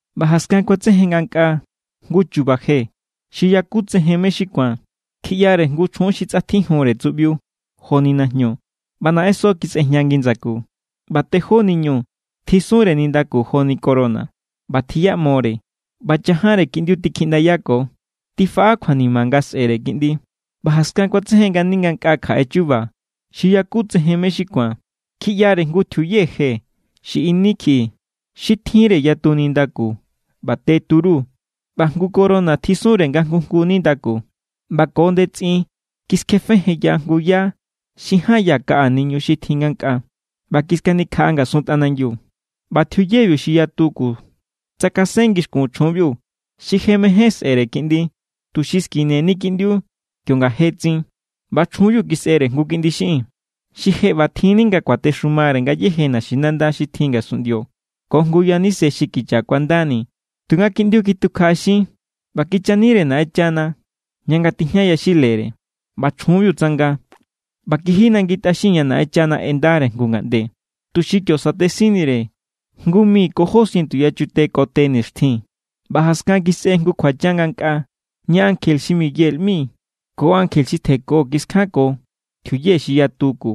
ꞌBa jaskan kuatsejen ngankꞌaa jngu chuba je xi yakutsejen mé= xi ku̱an. Kjiꞌyare jngu chjun xi tsꞌatjijunre tsuꞌbiu joni najñu, ꞌba naꞌenso kisꞌejña ngi ndsaku, ꞌba tejó niñu tjisunre nindaku joni corona. ꞌBa tjiꞌyamore ꞌba chajanre kiꞌndiu tikjiꞌndayako. Tifaꞌa kjuanima nga sꞌe̱re kiꞌndi. ꞌBa jaskan kuatsejen ngani ngankꞌaa kjaꞌe chuba xi yakutsejen mé= xi ku̱an. Kjiꞌyare jngu tjiuye je xi ini kjiꞌi. Xi tjinre yatu nindaku ꞌba te turu, ꞌba jngu corona tjisunre nga jngu jngu nindaku. ꞌBa ko ndetsꞌin kiskjefejenya jngu yá xi ján ya kaꞌa niñu xi tjin ngankꞌaa ꞌba kiskanikjaꞌa ngasun tꞌanangiu. ꞌBa tjiuyebiu xi yatu ku tsakasen ngixkun chjunbiu xi je mején sꞌe̱re kiꞌndi, tuxi skineni kiꞌndiu kionga je tsin. ꞌBa chjunbiu kisꞌere jngu kiꞌndi xiꞌin. Xi je ꞌbatjinni nga kuatexumare ngayéje naxinanda xi tjin ngasunꞌndio ko jngu yaníse xi kicha kuandani. Tunga kiꞌndiu kitukjaꞌaxin ꞌba kichanire Naꞌenchana ña nga tijña yaxilare. ꞌBa chjunbiu tsanga ꞌba kiji nangi tꞌaxin ña Naꞌenchana ꞌendare jngu ngaꞌnde, tuxi kio satesinnire jngu mi ko jó sientu yachute ko te nixtjin. ꞌBa jaskan kisꞌe jngu kjuachan ngankꞌaa, ña ankje xi Miguel ꞌmi ko ankje xi tjenko kiskjanko tjiuye xi yatu ku.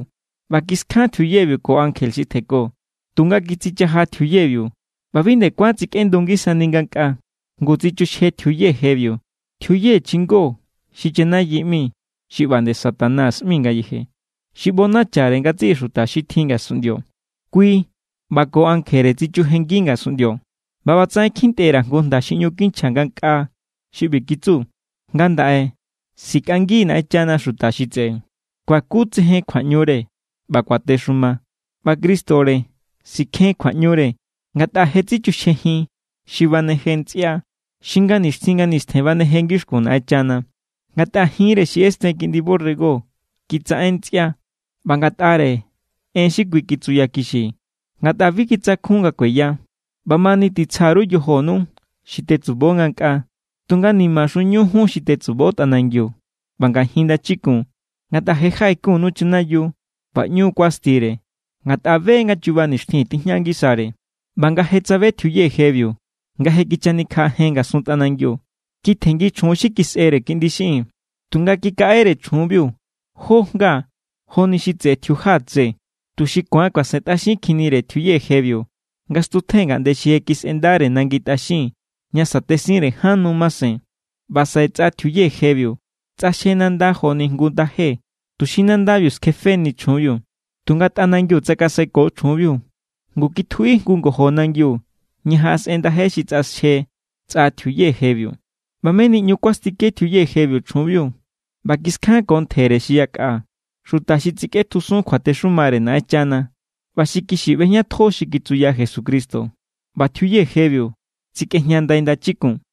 ꞌBa kiskjan tjiuyebiu ko ankje xi tjenko, tunga kitsichaja tjiuyebiu ꞌba bi nde kuán tsikꞌendu ngisani ngankꞌaa. Ngu tsichuxje tjiuye jebiu, tjiuye chingo xi chanayi ꞌmi, xi ꞌba nde Satanás ꞌmi ngayeje, xi ꞌbonachare ngatsiꞌi xuta xi tjin ngasunꞌndio. Kui ꞌba ko ankjere tsichujenngi ngasunꞌndio. ꞌBa ꞌbatsaꞌen kjintꞌe_ra̱ jngu jnda xi ꞌñu kinchja ngankꞌaa xi ꞌbi kitsu: Ngandaꞌe sikꞌangi= Naꞌenchana xuta xi tseꞌe, kuakutsejen kjuaꞌñure ꞌba kuatexuma, ꞌba Cristore sikjen kjuaꞌñure. Ngatꞌa je= tsichuxjejin xi baneje ntsꞌia, xi nga nixtjin nga nistjen baneje ngixkun Naꞌenchana. Ngatꞌare jinre xi ꞌesten Kiꞌndi borrego kitsaꞌen ntsꞌia, ꞌba ngatꞌare en xi kui kitsuyakixi, ngatꞌa bi kitsakjun nga kueya. ꞌBamani titsja_ru yojonu xi tetsubo ngankꞌaa. Tunga nimaxunu jun xi tetsubo tꞌanangiu ꞌba ngajin ndachikun, ngatꞌa je jaꞌejenkunnu chanayiu, ꞌba ꞌñu kuastire, ngatꞌa be= nga chuba nixtjin tijña ngisare. ꞌBa nga je tsabe tjiuye jebiu nga je kichanikjaꞌajen ngasun tꞌanangiu, kitjenngi chjun xi kisꞌere kiꞌndi xiꞌin. Tunga kikaꞌere chjunbiu jó jnga joni xi tseꞌe tjiuja tse, tuxi ku̱an kuasentꞌaxin kjinnire tjiuye jebiu nga stutjen ngaꞌnde xi je kisꞌendare nangi tꞌaxin ña sa̱tesinre ján nu masen. ꞌBa saꞌe tsꞌa tjiuye jebiu tsꞌaxje nanda joni jngu ndaje, tuxi nandabiu skjefeni chjunbiu. Tunga tꞌanangiu tsakaseko chjunbiu. Ngu kitjuꞌi jngu ngojo nangiu ña jaꞌasꞌen ndaje xi tsꞌaxje tsꞌa tjiuye jebiu. ꞌBa meni ꞌñu kuastike tjiuye jebiu chjunbiu ꞌba kiskjanko ntjere xi yakꞌa, xuta xi tsikꞌetjusun kjuatexumare Naꞌenchana ꞌba xi kixi ꞌbejñatjo xi kitsuya Jesucristo. ꞌBa tjiuye jebiu tsikꞌejña ndai ndachikun.